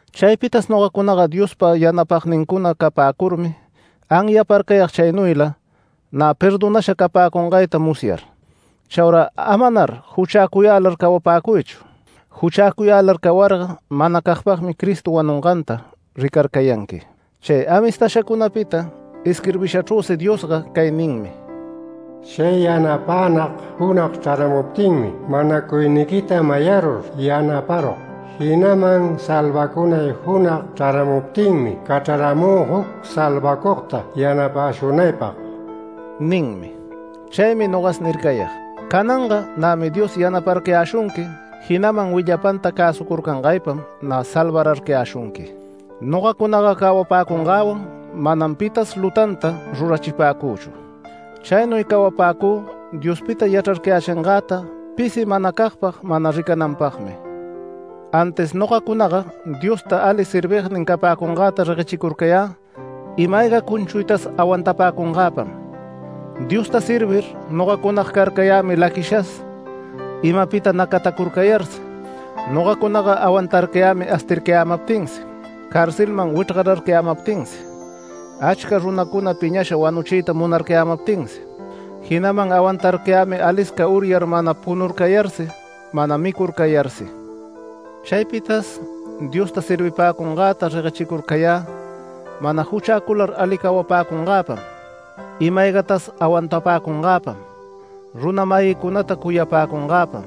Chaypitas nogacunaga Diospa yanapagnincuna capäcurmi anyaparcayag chaynuyla, nä perdonasha capäcungayta musyar. Chaura amanar juchäcuyälar cawapäcuychu. Juchäcuyälar cawarga manacagpagmi Cristo wanunganta ricarcayanqui. Chay amistashacunapita isquirbishachrüsi Diosga cay ninmi: “Chay yanapänag junag chraramuptinmi manacuyniquita mayarur yanaparug, jinaman salvacunay junag chraramuptinmi cachraramü juc salvacugta yanapäshunaypag” ninmi. Chaymi nogas nircayag: Cananga nämi Dios yanaparcayäshunqui jinaman willapanta cäsucurcangaypam nä salvararcayäshunqui. Nogacunaga cawapäcungäwan manam pitas lutanta rurachipäcüchu. Chaynuy cawapäcü Diospita yachrarcayächingäta pisi manacagpag mana ricananpagmi. Antis nogacunaga Diospa ali servignin capäcungäta reguechircurcayä ima-ayga cunchuytas awantapäcungäpam. Diosta servir nogacunaga carcayämi laquishas, imapita nacatacurcayarsi. Nogacunaga awantarcayämi astircayämaptinsi, carcelman wichrgararcayämaptinsi, achca runacuna piñasha wanuchiyta munarcayämaptinsi. Jinaman awantarcayämi alisca uryar mana punurcayarsi mana micurcayarsi. Chaypitas Diosta servipäcungäta reguechicurcayä mana juchäcular ali cawapäcungäpam, ima-aygatas awantapäcungäpam, runa-mayïcunata cuyapäcungäpam.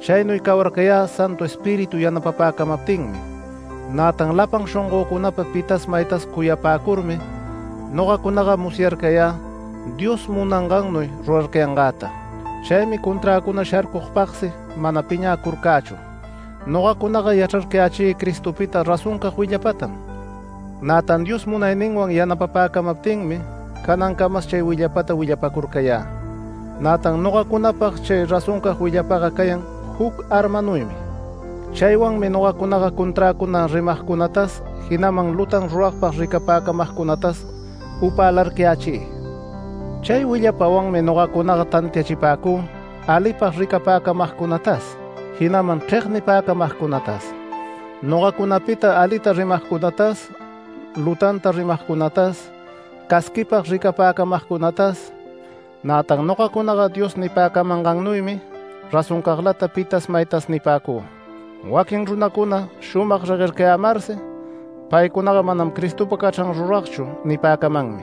Chaynuy cawayarcayä Santu Espíritu yanapapäcamaptinmi. Nätan lapan shongöcunapa pitas maytas cuyapäcurmi nogacunaga musyarcayä Dios munangannuy rurarcayangäta. Chaymi conträcuna sharcugpagsi mana piñäcurcächu. Nogacunaga yachrarcayächï Cristopita razoncag willapatam, nätan Dios munayninwan yanapapäcamaptinmi canancamas chay willapata willapacurcayä. Nätan nogacunapag chay razoncag willapaga cayan juc armanuymi. Chaywanmi nogacunaga conträcuna rimagcunatas jinaman lutan ruragpag ricapäcamagcunatas upälarcayächï. Chay willapawanmi nogacunaga tantiachipäcü alipag ricapäcamagcunatas, jinaman chregnipäcamagcunatas, nogacunapita alita rimagcunatas, lutanta rimagcunatas, casquipag ricapäcamagcunatas. Nätan nogacunaga Dios nipäcamangannuymi razoncaglata pi maytas nipäcü. Waquin runacuna shumag reguercayämarsi “Paycunaga manam Cristopa cachran ruragchu” nipäcamanmi.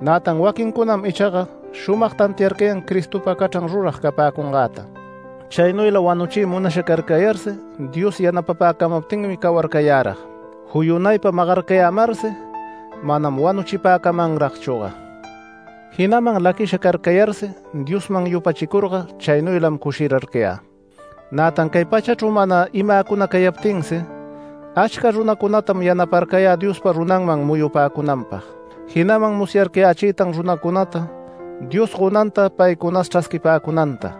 Nätan waquincunam ichaga shumag tantiarcayan Cristopa cachran rurag capäcungäta. Chaynuyla wanuchiy munasha carcayarsi Dios yanapäcamaptinmi cawarcayärag, juyunaypa magarcayämarsi manam wanuchipäcamanragchüga. Jinaman laquisha carcayarsi Diosman yupachicurga chaynuylam cushirarcayä, nätan cay pachachru mana imäcuna cayaptinsi, achca runacunatam yanaparcayä Diospa runanman muyupäcunanpag, jinaman musyarcayächïtan runancunata Dios gonanta paycunas chrasquipäcunanta,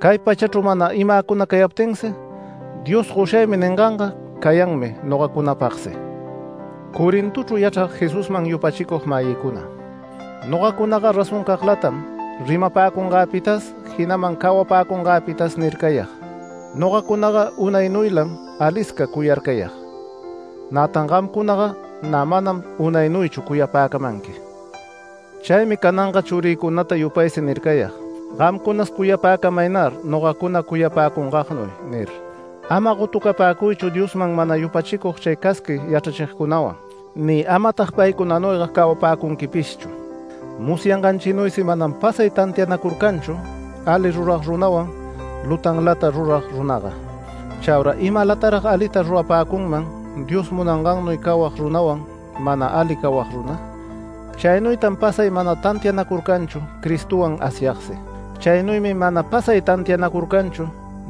cay pachachru mana imäcuna cayaptinsi Dios “Goshaymi” ninganga cayanmi nogacunapagsi. Corintochru yachrag Jesusman yupachicug-mayïcuna, nogacunaga razoncaglatam rimapäcungäpitas, jinaman cawapäcungäpitas nircayag. Nogacunaga unaynuylam alisca cuyarcayag. Nätan gamcunaga nä manam unaynuychu cuyapäcamanqui. Chaymi cananga churïcunata yupaysi nircayag: “Gamcunas cuyapäcamaynar nogacuna cuyapäcungagnuy” nir. Ama gotucapäcuychu Diosman mana yupachicug chay casqui yachrachigcunawan, ni amatag paycunanuyga cawapäcunquipishchu. Musyanganchinuysi manam pasay tantianacurcanchu ali rurag runawan lutalanta rurag runaga. Chaura ¿imalatarag alita rurapäcunman Dios munangannuy cawag runawan, mana ali cawag runa? Chaynuytan pasay mana tantianacurcanchu Cristowan Asyagsi. Chaynuymi mana pasay tantianacurcanchu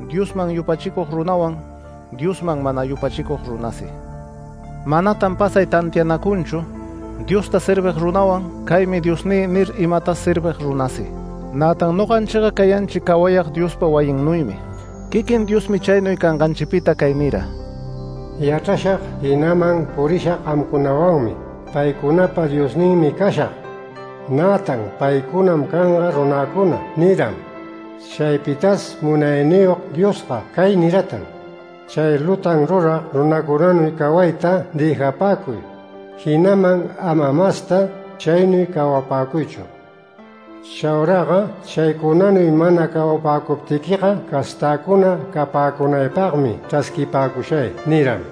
Diosman yupachicug runawan Diosman mana yupachicug runasi. Manatan pasay tantianacunchu Diosta servig runawan “Caymi diosnï” nir imatas servig runasi, nätan noganchiga cayanchi cawayag Diospa wayinnuymi. Quiquin Diosmi chaynuy canganchipita cay nira: “Yachrashag, jinaman purishag paycunawanmi. Paycunapa Diosninmi cashag, nätan paycunam canga runäcuna” niram. Chaypitas Munayniyog Diosga cay niratan: “Chay lutan rurag runacunanuy cawayta dëjapäcuy, jinaman ama masta chaynuy cawapäcuychu. Chauraga chaycunanuy mana cawapäcuptiquiga castäcuna capäcunaypagmi chrasquipäcushay” niram.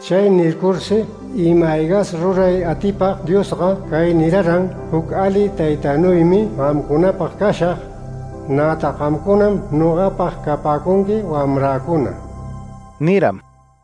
Chay nircursi ima-aygas ruray atipag Diosga cay niraran: “Juc ali taytanuymi gamcunapag cashag. Nätan gamcunam nogapag capäcunqui wamräcuna” niram.